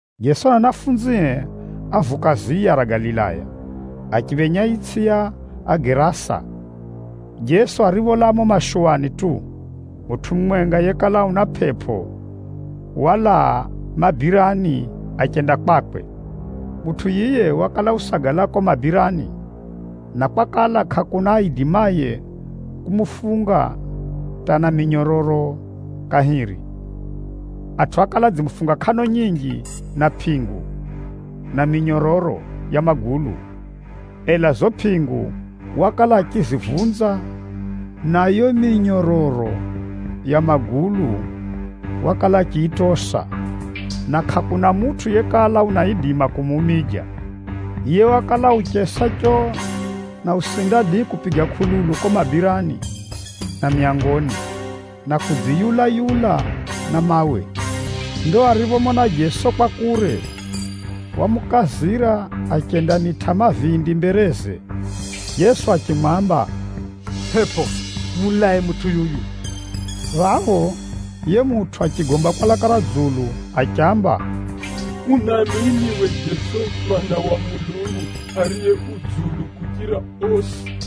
Jeso na anafunzie ávuka ziya ra Galilaya, achiphenya itsʼi ya Agerasa. Jeso aripholaa mumo mashuwani tu, mutʼu mumwenga yekala una mapepo, walaa mabirani achenda kwakwe. Mutʼu yiye wakala usagala kuko mabirani, na kwakala kʼakuna aidimaye kumufunga hata na minyororo kahiri. Atʼu ákala adzimufunga kʼano nyinji na pʼingu, na minyororo ya magulu. Ela zizo pʼingu wakala achizivunza, na yiyo minyororo ya magulu wakala achiyitosa, na kʼakuna mutʼu yekala unaidima kumuumija. Yiye wakala uchesa choo, na usinda dii, kupiga kʼululu kuko mabirani na myangoni, na kudziyula-yula na mawe. Ndo ariphomona Jeso kwa kure, wamukazira achendamitʼa mavindi mbereze. Jeso achimwamba, “Pʼepʼo muchafu, mulae mutʼu yuyu.” Phapho, yiye mutʼu achigomba kwa laka ra dzulu achiamba, “Unamini we Jeso Mwana wa Mulungu Ariye Dzulu kuchira osi?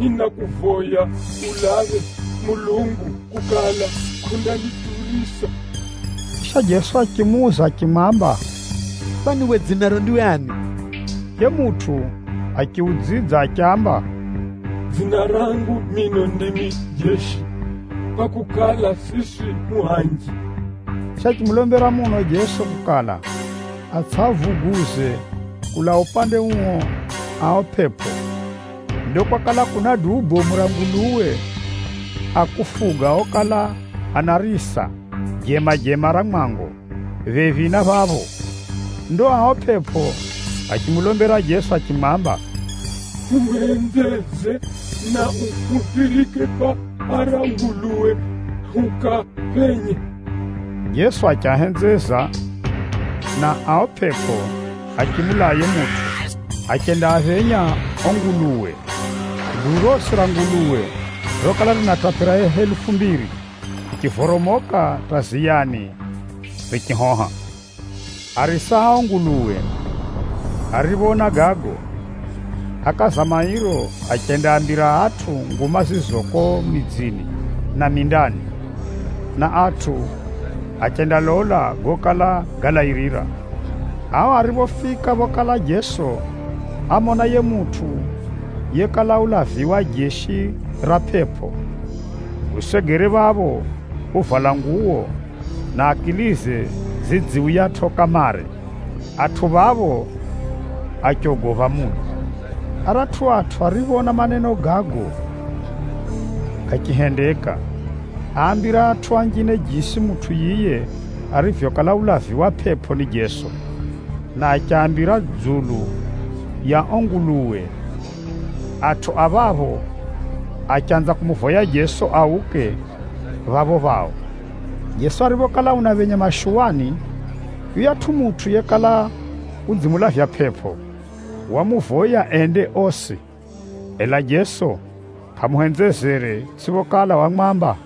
Ninakuvoya ulaphe Mulungu kukala, kʼundaniturisa!” Chisha Jeso achimuuza achimwamba, “Kwani we dzinaro ndiwe ani?” Yiye mutʼu achiudzidza achiamba, “Dzina rangu mino, ndimi ‘Jeshi,’ kwakukala, siswi hu anji.” Chisha achimulombera muno Jeso kukala, atsʼiavuguze kulaa upande uo ao pʼepʼo. Ndo kwakala kuna duu bomu ra nguluwe a kufuga okala anarisa jemajema ra mwango, phephi na phapho. Ndo ao pʼepʼo achimulombera Jeso achimwamba, “Huhenzeze na uhuphirike kwa ara nguluwe hukaaphenye.” Jeso achiahenzeza, na ao pʼepʼo achimulaa yiye mutʼu, achendaaphenya ao nguluwe. Duu rosi ra nguluwe rokala rinatapira helufu mbiri, richivoromoka hata ziyani richihoha. Arisa a ao nguluwe ariphoona gago, ákaza mairo achendaambira atʼu nguma zizo kuko midzini na mindani, na atʼu achendalola gokala galairira. Ao ariphofika phokala Jeso, ámona yiye mutʼu yekala ulaviwa jeshi ra pʼepʼo, usegere phapho uvala nguwo, na akilize zidziuyatʼo kamare. Atʼu phapho, achogopha muno. Aratʼu atʼu arioona maneno gago gachihendeka, áambira atʼu anjine jisi mutʼu yiye arivyokala ulaviwa pʼepʼo ni Jeso, na achiaambira dzulu ya ao nguluwe. Atʼu a jimbo riro achanza kumuvoya Jeso auke phapho phao. Jeso ariphokala unaphenya mashuwani, yuyatʼu mutʼu yekala udzimulavya pʼepʼo, wamuvoya ende osi. Ela Jeso kʼamuhenzezere, itsʼiphokala wamwamba,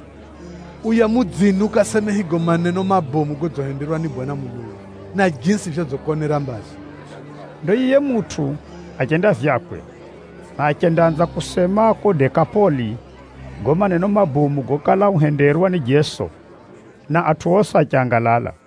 “Uya mudzini ukaseme higo maneno mabomu godzihenderwa ni Bwana Mulungu, na jisi vyodzikonera mbazi.” Ndo yiye mutʼu achenda vyakwe, na achendaanza kusema kuko Dekapoli, gago maneno mabomu gokala uhenderwa ni Jeso, na atʼu osi achangalala.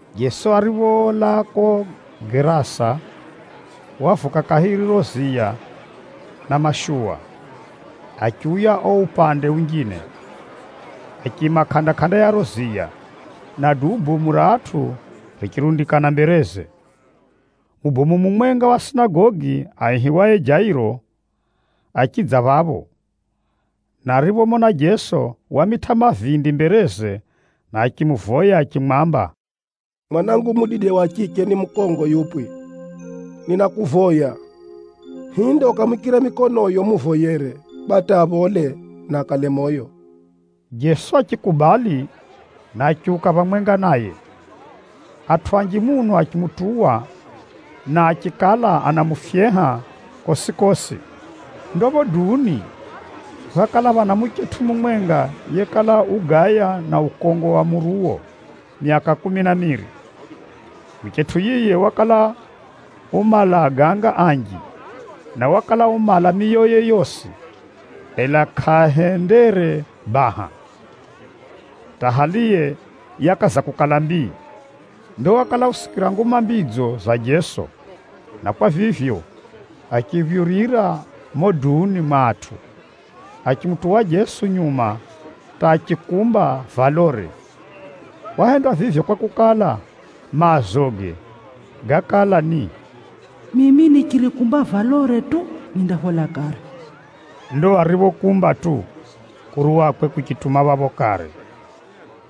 Jeso aripholaa kuko Gerasa, wavuka kahiri riro ziya na mashuwa, achiuya uo upande unjine. Achiima kʼanda-kʼanda ya riro ziya, na duu bomu ra atʼu richirundikana mbereze. Mubomu mumwenga wa sinagogi, aihiwaye Jairo achidza phapho, na ariphomona Jeso, wamitʼa mavindi mbereze na achimuvoya achimwamba, “Mwanangu mudide wa chiche ni mukongo yupwi. Ninakuvoya, hinde ukamwikire mikonoyo umuvoyere kwa hata aphole, na akale moyo.” Jeso achikubali, na achiuka phamwenga naye. Atʼu anji muno achimutuwa, na achikala anamufyeha kosi-kosi. Ndo phapho duuni, phákala phana muchetʼu mumwenga yekala ugaya na ukongo wa muruwo myaka kumi na miri. Muchetʼu yiye wakala umala aganga anji, na wakala umala miyoye yosi, ela kʼahendere baha, hata haliye yakaza kukala mbii. Ndo wakala usikira nguma mbidzo za Jeso, na kwa vivyo achiphyurira mumo duuni mwa atʼu achimutuwa Jeso nyuma hata achikumba valore. Wahenda vivyo, kwakukala, maazoge gákala ni, “Mimi nichirikumba valore tu, nindaphola kare.” Ndo ariphokumba tu, kuruwakwe kuchituma phapho kare,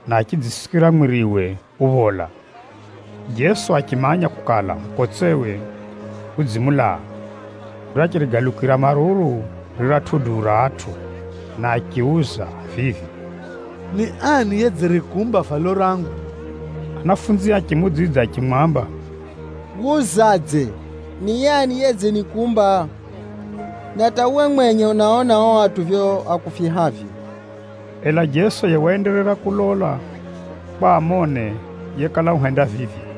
na achidzisikira mwiriwe uphola. Jeso achimanya kukala, mukotsewe udzimulaa. Ndo achirigalukira maruru riratʼu duu ra atʼu, na achiuza vivi, “Ni ani yedzirikumba valo rangu?” Anafunzie achimuudzidza achimwamba, “Wuzadze, ‘Ni ani yedzinikumba?’ Na hata uwe mwenye unaona ao atʼu vivyo akufyehavyo?” Ela Jeso yiye waenderera kulola kwa amone yekala uhenda vivyo.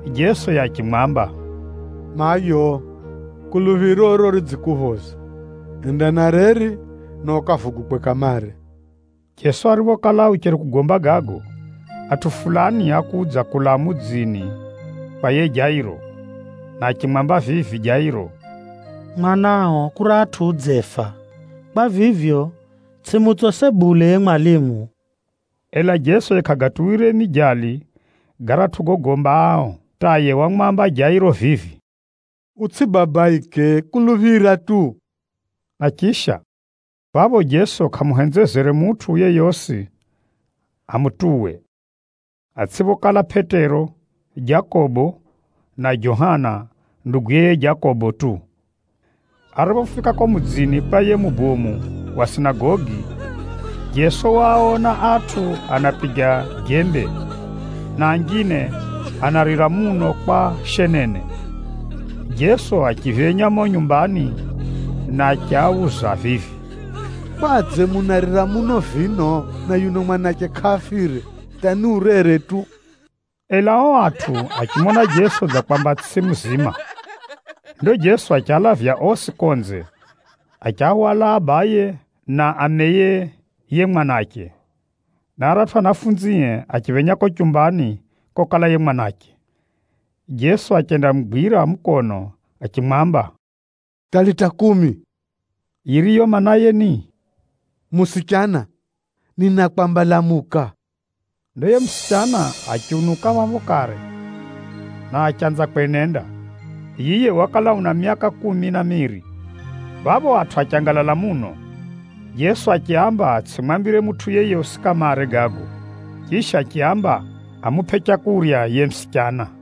Jeso yiye achimwamba, “Mayo, kuluphiroro ridzikuphoza. Enda na reri, na ukavugukwe kamare.” Jeso ariphokala ucheri kugomba gago, atʼu fulani ákudza kulaa mudzini kwa yiye Jairo, mubomu wa sinagogi na achimwamba vivi Jairo, “Mwanao kuratʼu udzefa. Kwa vivyo, tsʼimutsose bule yiye mwalimu.” Ela Jeso yiye kʼagatuwire mijali garatʼu gogomba ao, hata yiye wamwamba yiye mubomu wa sinagogi vivi, “Utsʼibabaike, kuluphira tu.” Na chisha, phapho Jeso kʼamuhenzezere mutʼu yeyosi amutuwe, atsʼiphokala Pʼetero, Jakobo na Johana nduguye yiye Jakobo tu. Ariphofika kuko mudzini kwa yiye mubomu wa sinagogi, Jeso waaona atʼu anapiga jembe, na anjine anarira muno kwa shenene. Jeso achiphenya mumo nyumbani, na achiauza vivi, “Kwadze munarira muno vino na yuno mwanache kʼafire, hata ni urere tu?” Ela ao atʼu achimona Jeso dza kwamba tsʼiye muzima. Ndo Jeso achialavya osi konze, achiahwala abaye na ameye yiye mwanache, na aratʼu anafunzie achiphenya kuko chumbani kokala yiye mwanache. Jeso achendamugwira mukono achimwamba, “Talita kumi!” Yiriyo maanaye ni, “Musichana, ninakwamba lamuka!” Ndo yiye musichana achiunuka phapho kare, na achanza kwenenda. (Yiye wakala una myaka kumi na miri.) Phapho atʼu achangalala muno. Jeso achiaamba atsʼimwambire mutʼu yeyosi kamare gago, chisha achiaamba amupʼe leu yiye musichana.